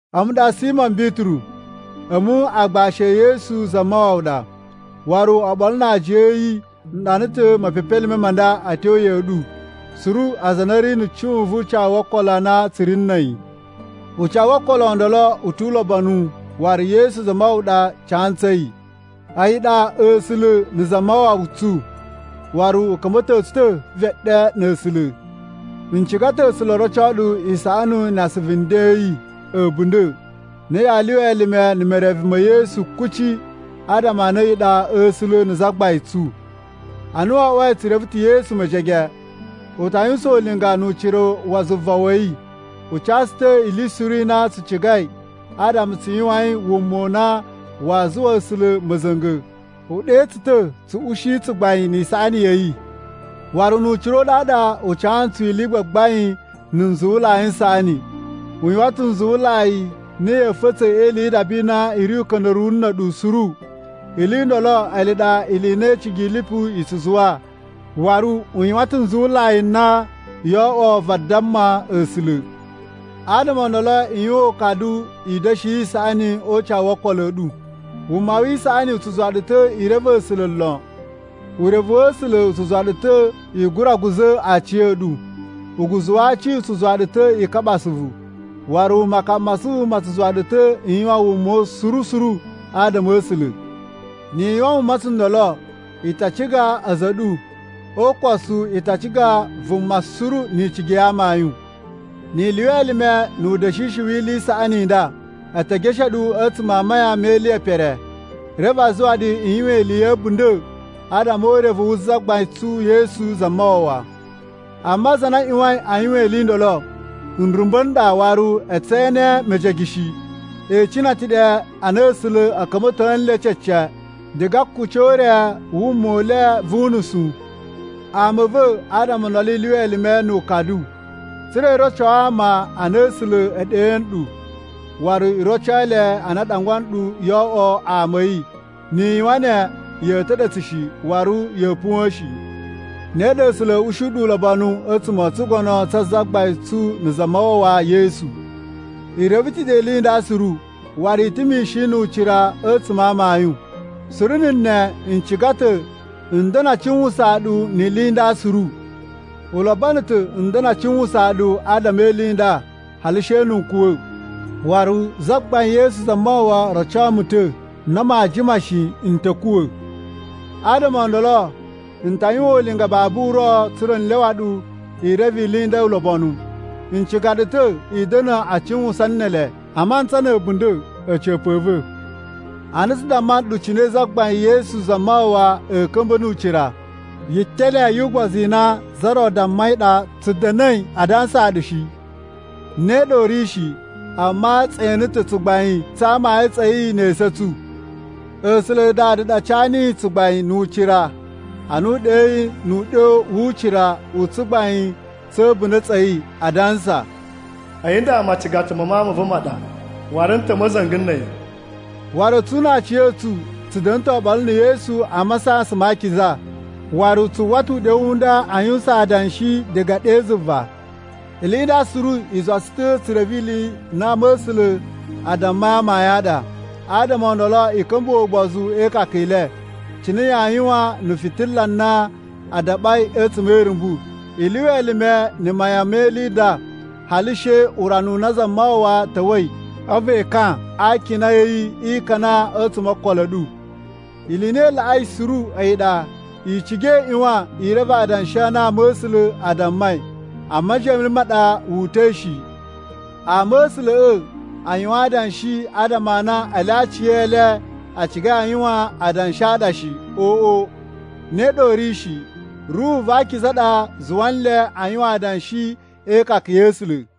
A̱mu ɗa Simo Bituru. A̱mu aagbashi e Yesu Zamawawa ɗa waru oɓolo na aajiya a̱ yi. N ɗana ta̱ mepepelime ma nda a̱ tyo ya̱ꞌa̱ ɗu suru aza a na a̱ ri na̱ cuꞌun vu ucawu wo okolo a na tsu ri na̱ a̱yi. Ucawu wo okolo o ndolo u tu ulobonu waru Yesu Zamawawa ɗa ca ntsu a̱yi. A̱yi ɗa A̱sula̱ na̱ Zamawawa tsu, waru u ka̱mba̱to tsu ta̱ veɗe na̱ A̱sula̱. N ciga ta̱ A̱sula̱ o roco ɗu isaꞌani na asuvu nden a̱ yi a̱ a̱bunda̱ a na yaa lyuwa elime na̱ mereve me Yesu kuci adama a na a̱yi ɗa A̱sula̱ na̱ Zagbain tsu. Ana wo oꞌwoi tsu reve ta̱ Yesu mejege, u ta yuwusan ulinga nu ucira wa zuva wa̱ yi, u ca tsu ta̱ ili suru i na tsu cigai adama tsu yuwain wuma u na waa zuwa A̱sula̱ ma̱za̱nga̱. U ɗe tsu ta̱ tsu ushi tsugbain ni isaꞌani ya̱ yi! Waru nu ucira u ɗaɗa, u ca ntsu ili i gbagbain na̱ nzuwulai n saꞌani. U yuwan ta̱ nzuwulai n na ya̱a̱ fa̱tsa̱ e ili yi idaba i na i ri uka̱nda̱ruwu na̱ a̱ɗu suru. Ili i ndolo ele ɗa ili i na icigi i lipu i tsu zuwa. Waru u yuwan ta̱ nzuwulai n na yoo oꞌwo vadamma A̱sula̱. Adama o ndolo i yuwan ukadu i da̱shi isaꞌani o ucawu wo okolo a̱ ɗu. Wuma wi isaꞌani u tsu zuwa ɗu ta̱ i reve A̱sula̱ lon. Urevu wa̱ A̱sula̱ u tsu zuwa ɗu ta̱ i gura guza̱ aciya̱ɗu. Uguzu wa aci u tsu zuwa ɗu ta̱ i kaɓa asuvu, waru makaɓa ma asuvu ma tsu zuwa ɗu ta̱ i yuwan wuma suru suru adama a̱ A̱sula̱. Ni i yuwan wuma tsundolo, i ta ciga a̱za̱ a̱ ɗu, o ukosu i ta ciga vuma suru ni icigi ya amayun. Ni i lyuwa elime nu uda̱shishi wi ili i saꞌani i nda, a̱ ta̱ geshe ɗu a̱tsuma̱ a mayan me ili ye pere, reve a zuwa ɗu i yuwan ili ya̱ a̱bunda̱ adama o urevu wu Zagbain tsu Yesu Zamawawa. Amma aza a na a ꞌyuwain a yuwan ili i ndolo nrumba̱ n ɗa waru e tse ene mejege shi. E icina ta̱ ɗe a na A̱sula̱ a̱ ka̱mba̱to nle cece diga a akuci o ure a wuma u le vu unusu. Ama a̱ va̱, adama o ndolo i lyuwa elime nu ukadu tsa̱ra̱ i roco ama a na A̱sula̱ e ɗe nɗu, waru i roco le a na a ɗangwa nɗu yoo oꞌwo ama a̱ yi. Ni i yuwan ne ya̱a̱ ta̱ɗa̱tsa̱ shi waru ya̱a̱ puwa̱a̱n shi. Ne ɗa A̱sula̱ a̱a̱ ushi ɗu ulobonu a̱tsuma̱ o tsugono tsa Zagbain tsu na̱ Zamawawa Yesu. I reve ta̱ ɗe ili i nda suru, waru i ta̱ mishin nu ucira a̱tsuma̱ a amayun. Suru na̱ ne n ciga ta̱ n da̱na̱ a cuwusaan ɗu ni ili i nda suru. U lobono ta̱ n da̱na̱ a cuwusaan ɗu adama e ili i nda hali she na̱ n kuwa̱. Waru Zagbain Yesu Zamawawa roco mu ta̱ na maa jima shi n ta̱ kuwa̱. Adama o ndolo n ta yuwan ulinga babu uro tsa̱ra̱ n lyawa ɗu i reve ili i nda ulobonu. N ciga ɗu ta̱ i da̱na̱ a cuwusan ne ele a mantsa na̱ a̱bunda̱ a̱ca̱pa̱ a̱ va̱. Ana tsu damma nɗu cine Zagbain Yesu Zamawawa a̱a̱ ka̱mba̱ nu ucira, yitele yu ugbozu i na za ro dammai ɗa tsu da̱na̱i a dansaa ɗu shi. Ne ɗa u ri shi! Amma tse ene ta̱ tsugbain tsa amayun tsa̱ yi ne esu a̱ tsu. A̱sula̱ Dada ɗa ca niyi tsugbain nu ucira ana u ɗeyi nu uɗyo wu ucira u Tsugbain tsa̱ A̱bunda̱ tsa̱ yi adansa, “A̱yi nda macigata ma Mawun ma̱ va̱ ma ɗa, waru n ta̱ ma̱za̱nga̱ na̱ a̱yi.” Waru a̱tsu na aciya̱tsu tsu da̱na̱ ta̱ oɓolo na̱ Yesu a masasan ma akiza, waru tsu uwwa ta̱ uɗyo u nda a yuwusan adanshi diga ɗe zuva. Ili i nda suru i zuwa tsu ta̱ tsu reve ili i na ama̱sula̱ a dammai amayun a ɗa. Adama o ndolo i ka̱mbuwa̱ ugbozu e ikaka i le, cine yaa yuwan na̱ fitila na a daɓai a̱tsuma̱ e irumbu. I lyuwa elime na̱ mayan me ili i nda, hali she urana u na Zamawawa ta̱wa̱i a̱vu ekan a akina a̱ yi e ikana a̱tsuma̱ o okolo a̱ ɗu. Ili i na i laꞌai suru a̱yi ɗa, i ciga i ꞌyuwan i reve adanshi a na ama̱sula̱ a dammai a majiyan me le ma ɗa wu uta̱i shi. Ama̱sula̱ꞌa̱ a yuwan adanshi adama a na ele aciyele a cigai a yuwan adanshi a ɗa shi. Oꞌo, ne ɗa u ri shi! Ruhu va Akiza ɗa zuwa nle a yuwan adanshi e ikaka ya̱ A̱sula̱.